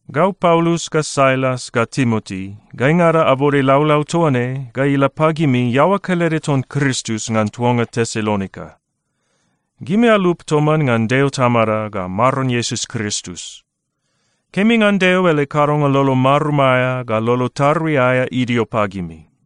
Gau Paulus ga Sailas ga Timoti, gaingada abode laulau toa ne ga ila pagimi iaoa kelede ton Kristus ngan tuanga Tesalonika. Gimi alup toman ngan Deo Tamada ga Maron Iesus Kristus. Kemi ngan Deo ele kadonga lolo marum aea ga lolo tarui aea idio pagimi.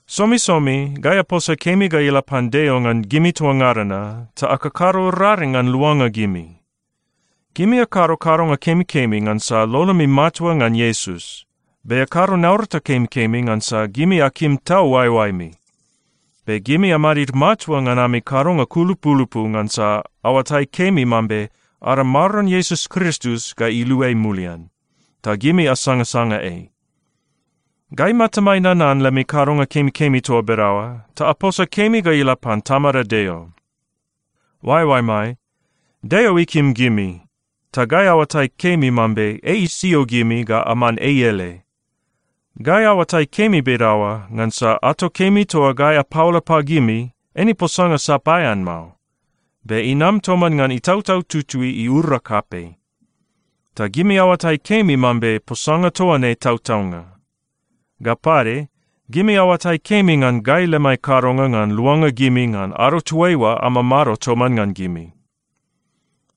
Somisomi gai aposa kemi ga ila pan Deo ngan gimi toa ngada na ta akakado raring ngan luanga gimi. Gimi akado kadonga kemikemi ngansa lolomi matua ngan Iesus. Be akado naurata kemikemi ngansa gimi akim tau oaeoaemi. Be gimi amadid matua ngan ami kadonga kulupulupu ngansa aoatai kemi mambe ada Maron Iesus Kristus ga iluai mulian, ta gimi asangasanga ei. Gai matamai nanan lemi kadonga kemikemi toa bedaoa ta aposa kemi ga ila pan Tamada Deo. Oaeoaemai, Deo ikim gimi, ta gai aoatai kemi mambe ei isio gimi ga aman ei ele. Gai aoatai kemi bedaoa ngansa ato kemi toa gai apaola pagimi eine posanga sapaean mao. Be inam toman ngan Itautau Tutui iura kapei. Ta gimi aoatai kemi mambe posanga toa ne tautaunga. Ga pade, gimi aoatai kemi ngan gai lemai kadonga ngan luanga gimi ngan ado toaiua amamado toman ngan gimi.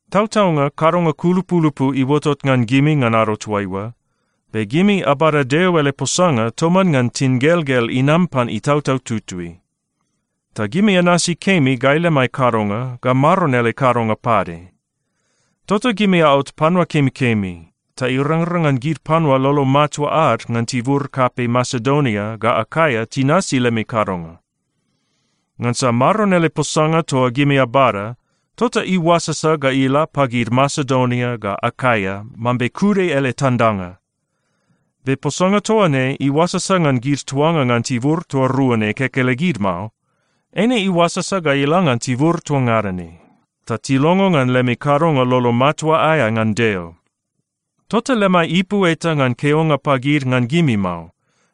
Tautaunga kadonga kulupulupu iuotot ngan gimi ngan ado toaiua, be gimi abada Deo ele posanga toman ngan tingelgel inam pan Itautau Tutui. Ta gimi anasi kemi gai lemai kadonga ga Maron ele kadonga pade. Tota gimi aot panua kemikemi, ta irangrang ngan gid panua lolo matua ad ngan tibur kapei Masedonia ga Akaia tinasi lemi kadonga. Ngansa Maron ele posanga toa gimi abada, tota iuasasa ga ila pagid Masedonia ga Akaia mambe kude ele tandanga. Be posanga toa ne iuasasa ngan gid tuanga ngan tibur toa rua ne kekelegid mao. Eine iuasasa ga ila ngan tibur toa ngada ne, ta tilongo ngan lemi kadonga lolo matua aea ngan Deo. Tota lemai ipu eta ngan keonga pagid ngan gimi mao.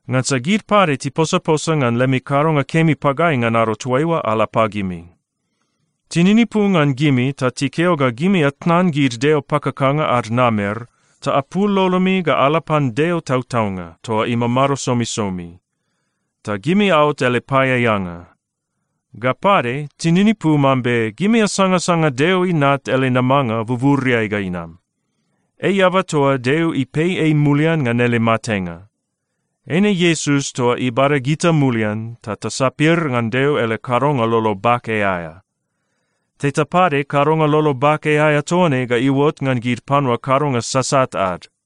Ngansa gid pade tiposaposa ngan lemi kadonga kemi pagai ngan ado toaiua ala pagimi. Tininipu ngan gimi ta tikeo ga gimi atnan gid deo pakakanga ad namer ta apul lolomi ga ala pan Deo tautaunga toa imamado somisomi. Ta gimi aot ele paeaeanga. Ga pade, tininipu mambe gimi asangasanga Deo Inat ele namanga buburiai ga inam. Ei eaba toa Deo ipei ei mulian ngan ele matenga. Eine Iesus toa ibada gita mulian ta tasapir ngan Deo ele kadonga lolo bake aea. Teta pade kadonga lolo bake aea toa ne ga iuot ngan gid panua kadonga sasat ad.